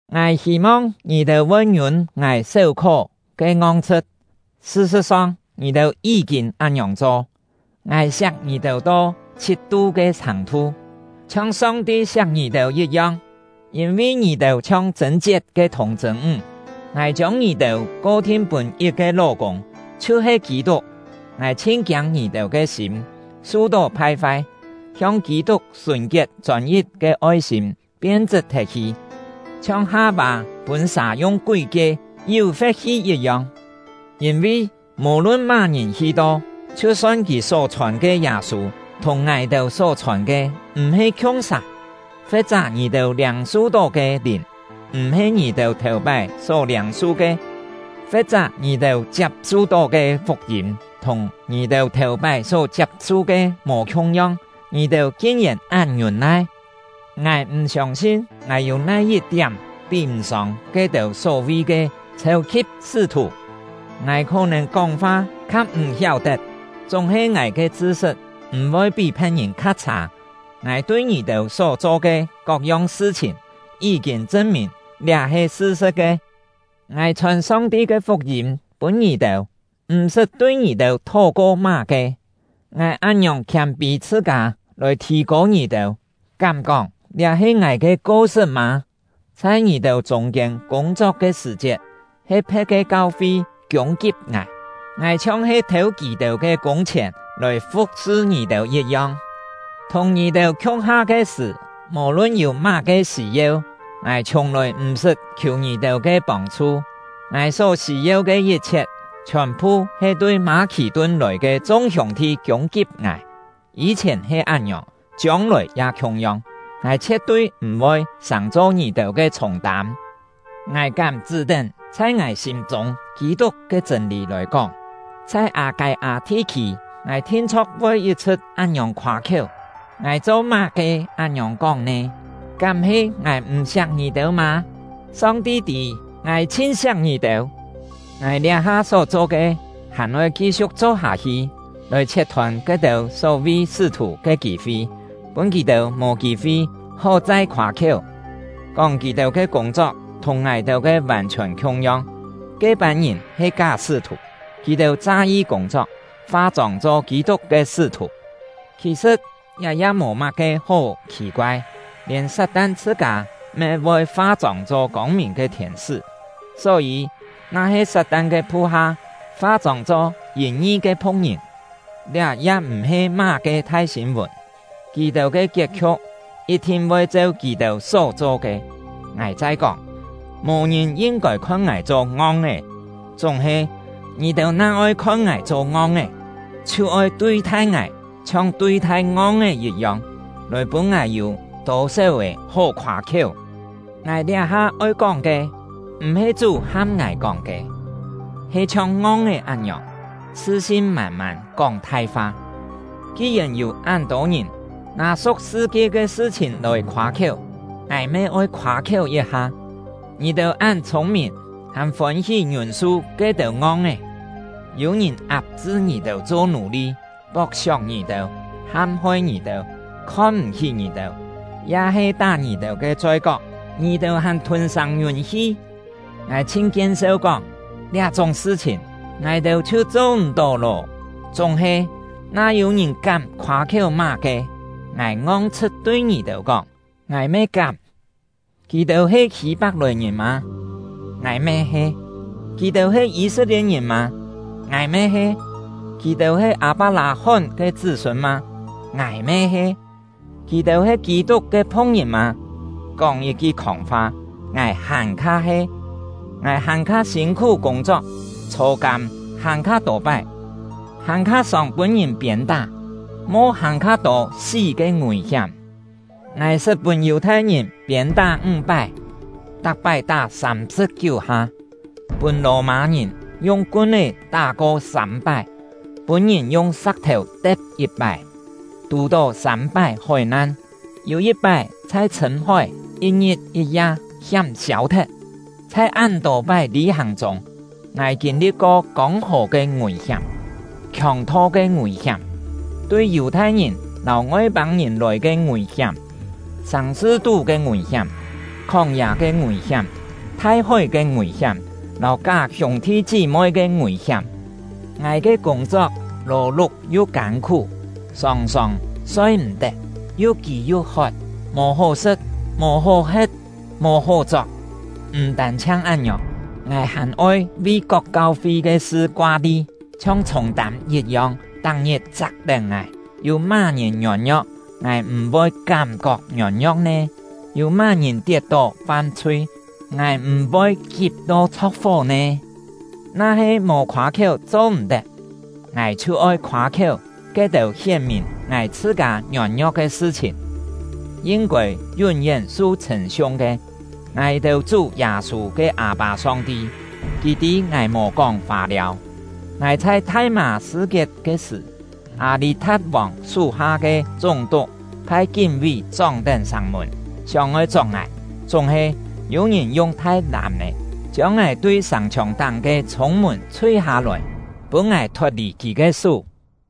Ngài hî-mong ngì-têu voi ngiûn ngài séu-khó ke ngong-chhṳ̍t; sṳ-sṳ̍t-song, ngì-têu yí-kîn án-ngiòng cho. Ngài siak ngì-têu to chhit-tu ke chhàng-thu, chhiong Song-ti siak ngì-têu yit-yong; yîn-vi ngì-têu chhiong chṳ̂n-chiet ke thùng-chṳ̂n-ńg, ngài chiông ngì-têu ko-thin pûn yit-ke ló-kûng, chhiu-he Kî-tuk. Ngài chhin-kiâng ngì-têu ke sîm su-tó phai-fai, hiong Kî-tuk sùn-kiet chôn-yit ke oi-sîm pien-chṳt thet-hi; chhiong Ha-vâ pûn sà yung kúi-kie yú-fe̍t hi yit-yong. Yîn-vi, mò-lun má-ngìn hi-to, chhiu-son kì só-chhòn ke Yâ-sû thùng ngài-têu só-chhòn ke m̀-he khiung-sà; fe̍t-chá ngì-têu liâng-su-tó ke lìn m̀-he ngì-têu thèu-pái só liâng-su ke; fe̍t-chá ngì-têu chiap-su-tó ke fuk-yîm thùng ngì-têu thèu-pái só chiap-su ke mò khiung-yong, ngì-têu kin-yèn án ngiûn-nai! Ngài m̀ siông-sin ngài yû nai-yit-tiám pí-m̀-sông ke-têu só-vi ke “chhêu-khi̍p sṳ́-thù”! Ngài khó-nèn kóng-fa kha m̀ hiáu-tet, chúng-he ngài ke chṳ-sṳt m̀-voi pí phe̍t-ngìn kha chhâ; ngài tui ngì-têu só-cho ke kok-yong sṳ-chhìn, yí-kîn chṳn-mìn liá he sṳ-sṳ̍t ke. Ngài chhòn Song-ti ke fuk-yîm pûn ngì-têu, m̀-sṳt tui ngì-têu thó-ko má-ke; ngài án-ngiòng khiâm-pî chhṳ-kâ lòi thì-kô ngì-têu, kám-kóng liá he ngài ke ko-sṳt mâ? Chhai ngì-têu chûng-kiên kûng-chok ke sṳ̀-chiet, he phe̍t ke kau-fi kiûng-kip ngài; ngài chhiong-he thêu kì-têu ke kûng-chhièn lòi fu̍k-sṳ ngì-têu yit-yong. Thùng ngì-têu khiung-ha ke sṳ̀, mò-lun yû má-ke sî-yeu, ngài chhiùng-lòi m̀-sṳt khiù ngì-têu ke pông-chhu. Ngài só sî-yeu ke yit-chhiet, chhiòn-phu he tui Mâ-khì-tun lòi ke chung hiûng-thi kiûng-kip ngài. Yî-chhièn he án-ngiòng, chiông-lòi ya khiung-yong; ngài chhie̍t-tui m̀-voi sàng-cho ngì-têu ke chhûng-tâm! Ngài kám chṳ́-tén chhai ngài sîm-chûng Kî-tuk ke chṳ̂n-lî lòi kóng, chhai Â-kâi-â thi-khî, ngài thin-chho̍k voi yit-chhṳ̍t án-ngiòng khoâ-khiéu. Ngài cho-má-ke án-ngiòng kóng nè? Kám he ngài m̀ siak ngì-têu mâ? Song-ti tî, ngài chhin siak ngì-têu! Ngài liá-ha só-cho ke, hàn-oi ki-siu̍k cho-hâ-hi, lòi chhiet-thôn ke-têu só-vi “sṳ́-thù” ke kî-fi, pûn kì-têu mò kî-fi hó chai khoâ-khiéu, kóng kì-têu ke kûng-chok thùng ngài-têu ke vàn-chhiòn khiung-yong. Ke-pân ngìn he ká sṳ́-thù; kì-têu cha-yi kûng-chok, fa-chông cho Kî-tuk ke sṳ́-thù. Khì-sṳ̍t, liá ya mò má-ke hó khì-koai, lièn Sat-tan chhṳ-kâ me voi fa-chông cho kông-mìn ke thiên-sṳ́! Só-yî, na-he Sat-tan ke phu-ha fa-chông cho yìn-ngi ke phu̍k-ngìn, liá ya m̀-he má-ke thai sîn-vùn. Kì-têu ke kiet-khiu̍k yit-thin voi cheu kì-têu só-cho ke. Ngài chai kóng: Mò ngìn yin-kôi khon ngài cho ngong-é; chúng-he, ngì-têu na oi khon ngài cho ngong-é, chhiu oi tui-thai ngài chhiong tui-thai ngong-é yit-yong, lòi pûn ngài yû tô-séu-è hó khoâ-khiéu! Ngài liá-ha oi kóng ke, m̀-he Chú ham ngài kóng ke; he chhiong ngong-é án-ngiòng, chhṳ-sin mân-mân kóng thai-fa. Ki-yèn yû án-tô ngìn nâ su̍k sṳ-kie ke sṳ-chhìn lòi khoâ-khiéu, ngài me oi khoâ-khiéu yit-ha. Ngì-têu án chhûng-mìn, hàn fôn-hí ngiûn-su ke-têu ngong-é! Yû-ngìn ap-chṳ ngì-têu cho nù-li, pok-siok ngì-têu, ham-hoi ngì-têu, khon-m̀-hí ngì-têu, ya-he tá ngì-têu ke choi-kok, ngì-têu hàn thûn-sâng ngiûn-hi! Ngài chhin kien-seu kóng, liá-chúng sṳ-chhìn ngài-têu chhiu cho m̀-tó lô! Chúng-he, na yû-ngìn kám khoâ-khiéu má-ke, ngài ngong-chhṳ̍t tui ngì-têu kóng: Ngài me kám! Kì-têu he Hî-pak-lòi-ngìn mâ? Ngài me he. Kì-têu he Yî-set-lie̍t-ngìn mâ? Ngài me he. Kì-têu he Â-pak-lâ-hón ke chṳ́-sûn mâ? Ngài me he. Kì-têu he Kî-tuk ke phu̍k-ngìn mâ? Kóng yit-ki khòng-fa, ngài hàn-kha he! Ngài hàn-kha sîn-khú kûng-chok, chhô-kâm hàn-kha tô pái, hàn-kha sòng pûn-ngìn piên-tá, mo hàn-kha tô sí ke ngùi-hiám. Ngài sṳt pûn Yù-thai-ngìn piên-tá ńg-pái, tak-pái tá sâm-sṳ̍p-kiú ha; pûn Lò-mâ-ngìn yung kun-é tá-ko sâm-pái, pûn-ngìn yung sa̍k-thèu te̍p yit-pái, tù-tó sâm-pái hói-nan, yû yit-pái chhai chhṳ̂m-hói yit-ngit yit-ya hiám siâu-thet. Chhai án-tô pái lî-hàng chûng, ngài kîn-li̍t-ko kông-hò ke ngùi-hiám, khiòng-tho ke ngùi-hiám, tui Yù-thai-ngìn lâu Ngoi-pâng-ngìn lòi ke ngùi-hiám, sàng-sṳ-tú ke ngùi-hiám, khóng-yâ ke ngùi-hiám, thai-hói ke ngùi-hiám, lâu ká hiûng-thi chí-moi ke ngùi-hiám. Ngài ke kûng-chok lò-luk yu kân-khú, sòng-sòng soi-m̀-tet, yu kî yu hot, mò hó sṳ̍t, mò hó he̍t, mò hó chok. M̀ tân-chhiang án-ngiòng, ngài hàn oi vi kok kau-fi ke sṳ koa-li, chhiong chhûng-tâm yit-yong tak-ngit chak-tén ngài. Yû má-ngìn ngiôn-ngio̍k, ngài m̀-voi kám-kok ngiôn-ngio̍k nè? Yû má-ngìn tiet-tó fam-chhui, ngài m̀-voi kip to chho̍k-fó nè? Na-he mò khoâ-khiéu cho-m̀-tet, ngài chhiu oi khoâ-khiéu ke-têu hién-mìn ngài chhṳ-kâ ngiôn-ngio̍k ke sṳ-chhìn. Yin-kôi yún-yén su chhṳ̂n-siung ke, ngài-têu Chú Yâ-sû ke Â-pâ Song-ti, Kì tî ngài mò kóng fâ-liâu. Ngài chhai Thai-mâ-sṳ-kiet ke sṳ̀, Â-lî-tha̍t-vòng sú-ha ke chúng-tuk phai kín-ví chóng-tén sàng-mùn, sióng-oi chok ngài. Chúng-he, yû-ngìn yung thai làm-è chiông ngài tui sàng-chhiòng-táng ke chhûng-mùn chhui-hâ-lòi, pûn ngài thot-lì kì ke sú.